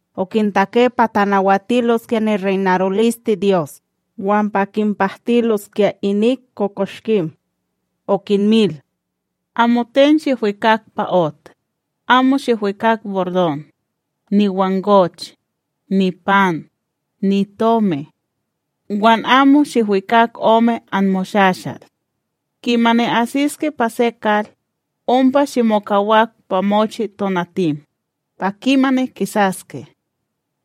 Okintake pa tanawatiloskya nireynarolisteDyos, wan pa kinpahtiloskya inik kokoshkim. Okinmil: ―Amoten shihwikak pa ot, amo shihwikak bordon, niwangoch, nipan, nitomi. Wan amo shiwikak ome anmoshashal. Kimani asiske pa se kal, ompa shimokawak pa mochi tonatim, pa kimani kisaske.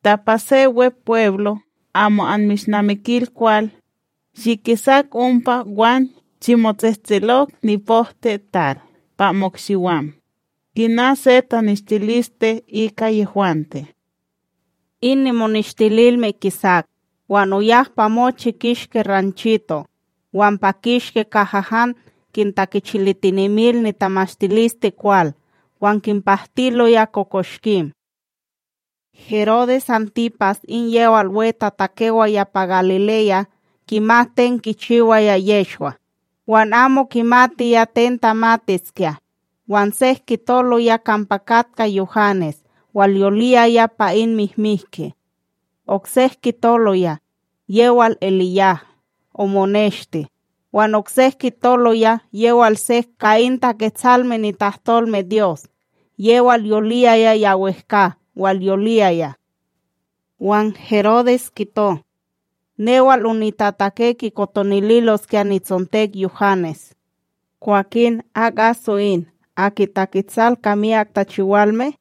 Ta pa se Wepweblo amo anmishnamikil kwal, shikisak ompa wan shimotsehtselok nipohtiTal pa mo'ikshiwam, kina se taneshtiliste ika yehwante. In moneshtililme kisak, wan oyak pa mochi kishki ranchito', wan pa kishki kaha han kintakechilitinemil nitamashtilisteKwal wan kinpahtiloya kokoshkim. Herodes Antipas in yewal wetatakewaya pa Galileya kimat ten kichiwaya Yehshwa; wan amo kimatiya ten tamatiskya, wan sek kitoloya kampa katka Yuhanes walyoliyaya pa in mihmihki. Oksek kitoloya: Yewal EliYaha omoneshti; wan oksek kitoloya yewal sek ka in Taketsalme nitahtolmeDyos yewal yoliyiya ya wehkA walyoliyaya. Wan Herodes kito: ―Newal onitatake kikotonililoskya nitsontek Yuhanes. Kwakin, ak aso in, aki taketsal ka myak tachiwalme?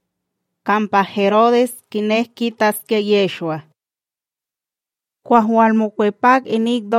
Kampa Herodes kinek kitaskya Yehshwa. Kwah walmokwepak inik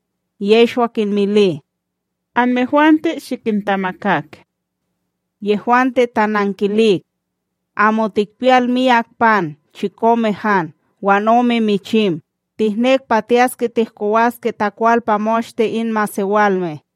Yehshwa kinmili: ―Anmehwante shikintamakak. Yehwante tanankilik: ―Amo tikpiyal miyak pan chikome han wan ome michim, tihnek pa tiyaske tihkowaske takwal pa moshte in masewalme.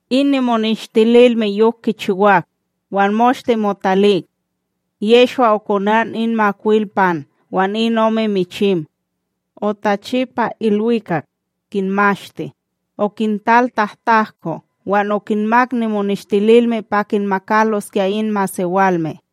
In nimoneshtililme yok kichiwak, wan moshte motalik. Yehshwa okonan in makwil pan wan in ome michim. Otachi pa ilwikak, kinmashti, okintal tahtahko wan okinmak nimoneshtililme pa kinmakaloskya in masewalme.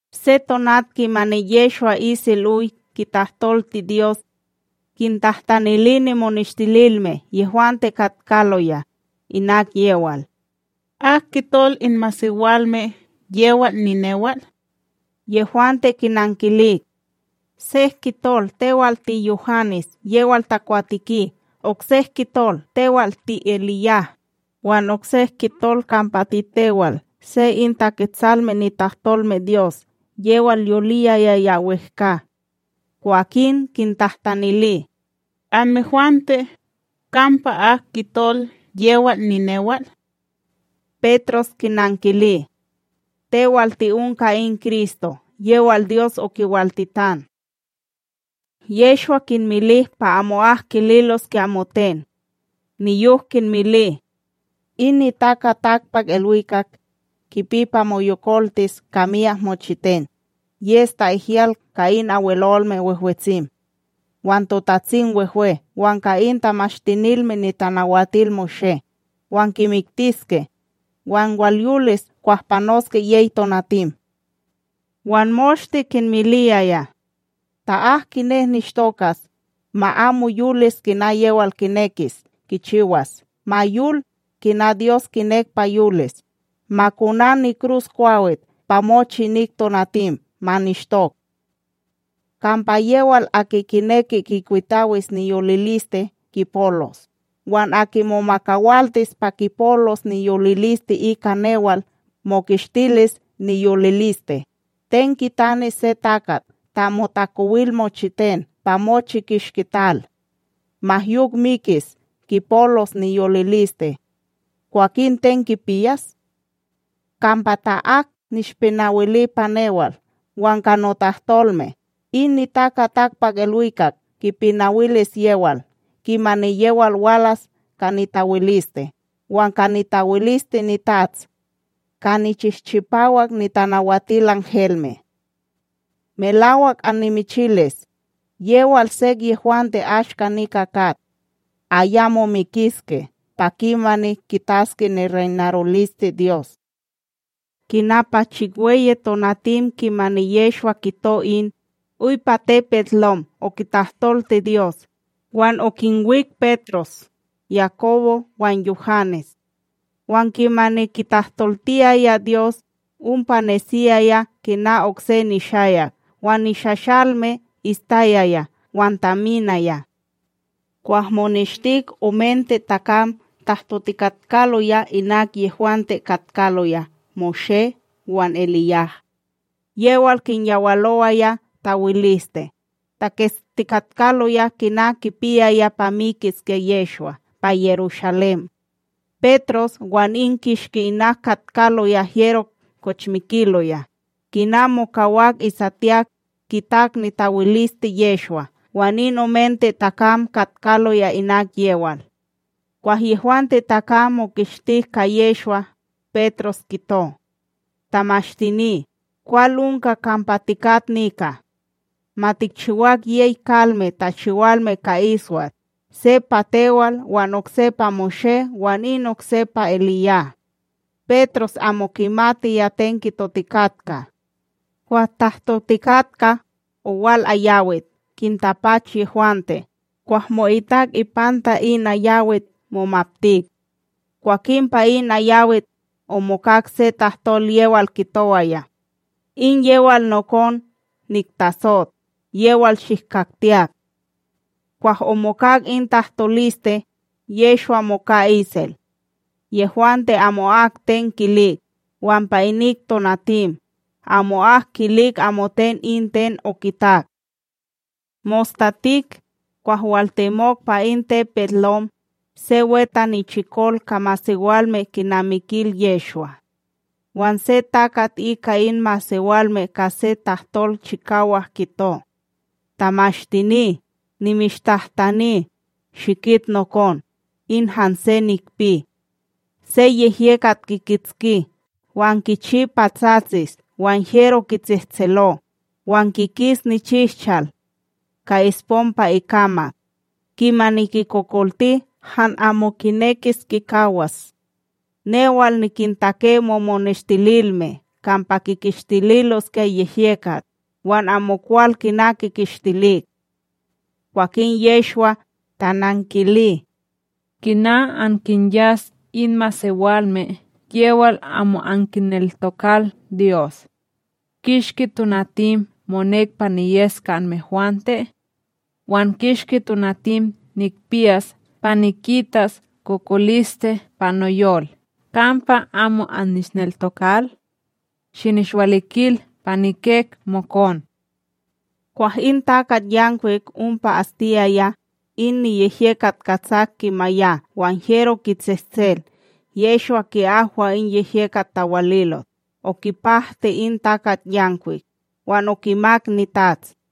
Se tonat kimani Yehshwa isel oy kitahtolti Dyos, kintahtanili Nimonestililme yehwante katkaloya, inak yewal: ―Ak kitol in masewalme yewal ninewal? Yehwante kinankilik: ―Sek kitol tewal tiYuhanes yewal takwateki; oksek kitol tewal tiEliYah, wan oksek kitol kampa titewal se in Taketsalme nitahtolmeDyos yewal yoliyaya ya wehkA. Kwakin kintahtanili: ―Anmehwante, kampa ak kitol yewal ninewal? Petros kinankili: ―Tewal ti'onka in Kristo yewal Dyos okiwaltitan. Yehshwa kinmili pa amo'ak kililoskya amoten. Niyok kinmili: ―In NitakaTakpakIlwikak kipi pa moyokoltis ka myak mochiten, yes ta'ihyal ka in Abwelolme Wehwetsim, wan TotatsimWehwe wan ka in Tamashtinilme NitanawatilMoshé. Wan kimiktiske, wan walyolis kwah panoske yey tonatim. Wan moshte kinmiliyaya: ―Ta ak kinek nishtokas, ma amo yolis kina yewal kinekis kichiwas, ma yol kina Dyos kinek pa yolis, ma konan nikruskwawit pa mochi inik tonatim, ma nishtok. Kampa yewal aki kineki kikwitawis niyoliliste, kipolos; wan aki momakawaltis pa kipolos niyoliliste ika newal, mokishtilis niyoliliste. Ten kitanis se takat ta motakowil mochiten pa mochi kishki tal, ma yok mikis kipolos niyoliliste kwakin ten kipiyas? Kampa ta ak nishpinawili pa newal wan ka notahtolme, in NitakaTakpakIlwikak kipinawilis yewal, kimani yewal walas ka nitawiliste wan ka nitawiliste niTats ka nichihchipawak nitanawatilanhelme. Melak annimichilis, yewal sek yehwante ashka nika kat, ayamo mikiske pa kimani kitaske nireynarolisteDyos. Kina pa chikweyi tonatim kimani Yehshwa kito in, oy pa tepetLom okitahtolti Dyos, wan okinwik Petros, Yakobo wan Yuhanes. Wan kimani kitahtoltiyaya Dyos, ompa nesiyaya kina okse nishayak wan nishashalme ishtayaya wan taminaya. Kwah moneshtik omente takam tahtotikatkaloya inak yehwante katkaloya Moshé wan EliYah, yewal kinyawalowaya tawiliste, taketstikatkaloya kina kipiyaya pa mikiskya Yehshwa pa Yerushalém. Petros wan in kishki inak katkaloya hyero kochmikiloya, kina mokawak isatiyak, kitak nitawiliste Yehshwa wan in omente takam katkaloya inak yewal. Kwah yehwante takam mokishtik ka Yehshwa, Petros kito: ―Tamashtini, kwal onka kampa tikat nika! Ma tikchiwak yey kalme tachiwalme ka iswat; se pa tewal, wan okse pa Moshé wan in okse pa EliYah. Petros amo kimatiya ten kitotikatka. Kwah tahtotikatka, owal ayawit kintapach yehwante, kwah mo'itak ipanta in ayawik momaptik. Kwakin pa in ayawit, omokak se tahtol yewal kitowaya: ―In yewal nokon niktasot; yewal shihkaktiyak. Kwah omokak in tahtoliste, Yehshwa moka isel. Yehwante amo'ak ten kilik, wan pa inik tonatim, amo'ak kilik amoten in ten okitak. Mostatik, kwah waltemok pa in tepetLom, se we tanichikol ka masewalme kinamikil Yehshwa. Wan se takat ika in masewalme ka se tahtol chikawak kito: ―Tamashtini, nimishtahtani, shikit nokon, in hanse nikpi; se yehyekat kikitski wan kichi pa tsatsis wan hyero kitsehtselo, wan kikis nichihchal ka espom pa ikamak. Kimani kikokolti han amo kinekis kimakawas. Newal nikintake momoneshtililme kampa kikishtiloskya yehyekat, wan amokwal kina kikishtilik. Kwakin Yehshwa tanankili: ―Kina ankinyas in masewalme yewal amo ankineltokal Dyos! Kishki tonatim monek pa niyes ka anmehwante? Wan kishki tonatim nikpiyas pa nikitas kokoliste pa noyol kampa amo annishneltokal? Shinishwalikil pa nikek mokon. Kwah in takatYankwik ompa astiyaya, in niyehyekat katsak kimaya wan hyero kitsehtsel Yehshwa ki'ahwa in yehyekat tawalilot, okipahti in takatYanwik, wan okimak nitats.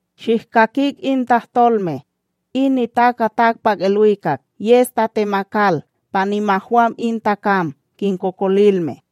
―Shihkakik in tahtolme; in NitakaTakpakIlwikak yes tatemakal pa nimahwam in takam kinkokolilme.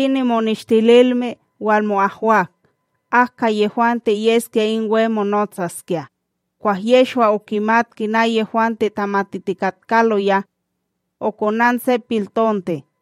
Kwakin nimoneshtililme walmo'ahwak ak ka yehwante yeskya in we monotsaskya, kwah Yehshwa okimat kina yehwante tamatitikatkaloya. Okonan se piltonte,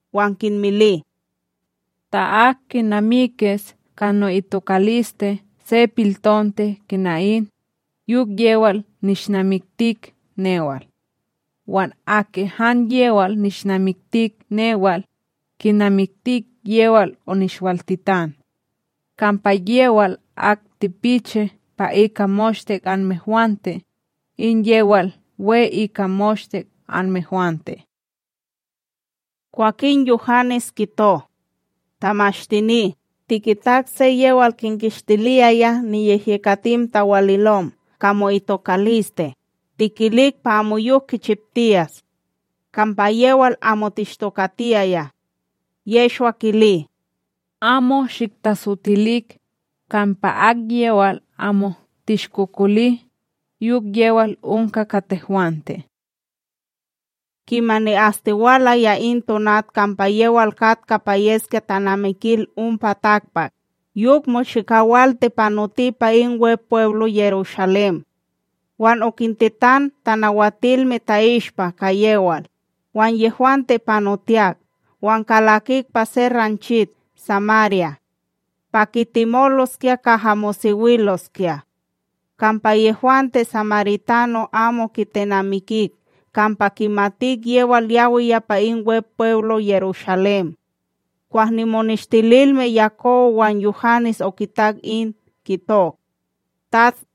wan kinmili: ―Ta ak kinamikis ka no'itokaliste se piltonte kina in, yok yewal nishnamiktik newal; wan aki han yewal nishnamiktik newal, kinamiktik yewal onishwaltitan. Kampa yewal ak tipichi pa ika moshte anmehwante, in yewal we ika moshte anmehwante. Kwakin Yuhanes kito: ―Tamashtini, tikitak se yewal kinkishtiliyaya niyehyekatim tawalilom ka mo'itokaliste; tikilik pa amoyok kichiptiyas, kampa yewal amo tishtokatiyaya. Yehshwa kili: ―Amo shiktatsotilik; kampa akyewal amo tishkokoli, yok yewal onka ka tehwante. Kimani astiwalaya in tonat kampa yewal katka pa yeskya tanamikil ompa takpak, yok mochikawalti panoti pa in Wepweblo Yerushalém. Wan okintetan tanawatilme ta'ishpa ka yewal, wan yehwante panotiyak wan kalakik pa se ranchit Samarya pa kitemoloskya kaha mosewiloskya; kampa yehwante samaritano amo kitenamikik kampa kimatik yewal yawiya pa in Wepweblo Yerushalém. Kwah nimoneshtililme Yakobo wan Yuhanes okitak in, kitok: ―TATS,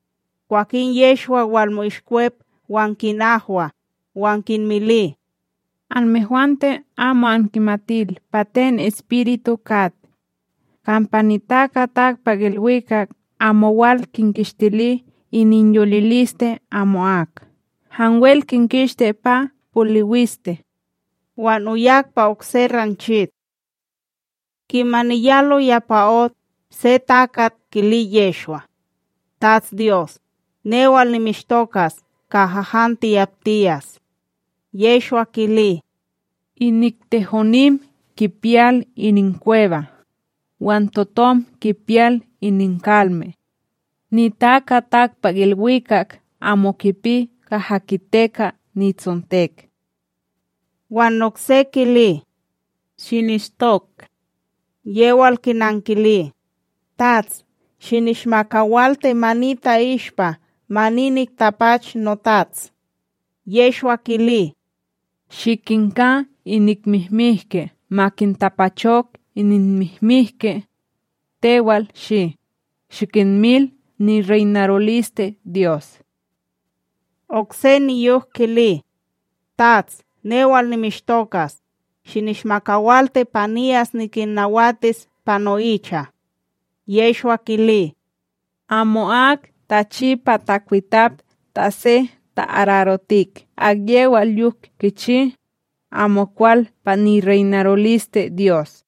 Kwakin Yehshwa walmo'ishkwep wan kinahwa, [wan kinmili: ―Anmehwante amo ankimatil pa ten espiritu kat. Kampa NitakaTakpakIlwikak amo wal kinkishtili ininyoliliste amo'ak, hanwel kinkishti pa poliwiste].c Wan oyak pa okse ranchit. Kimani yaloya pa ot, se takat kili Yehshwa: ―TatsDyos, newal nimishtokas kaha han tiyaptiyas. Yehshwa kili: ―Inik tehomim kipiyal ininkweba, wan totom kipiyal ininkalme; NitakaTakpakIlwikak amo kipi kaha kiteka nitsontek. Wan okse kili: ―Shinishtok. Yewal kinankili: ―Tats, shinishmakawalti ma ni ta'ishpa ma ni niktapach notats. Yehshwa kili: ―Shikinka inik mihmike ma kintapachok ininmihmihke; tewal shi, shikinmil nireynarolisteDyos. Okse niyok kili: ―Tats, newal nimishtokas, shinishmakawalti pa niyas nikinnawatis pa no'icha. Yehshwa kili: ―Amo'ak tachi pa takwitap ta se ta'ararotikd akyewal yok kichi, amokwal pa nireynarolisteDyos.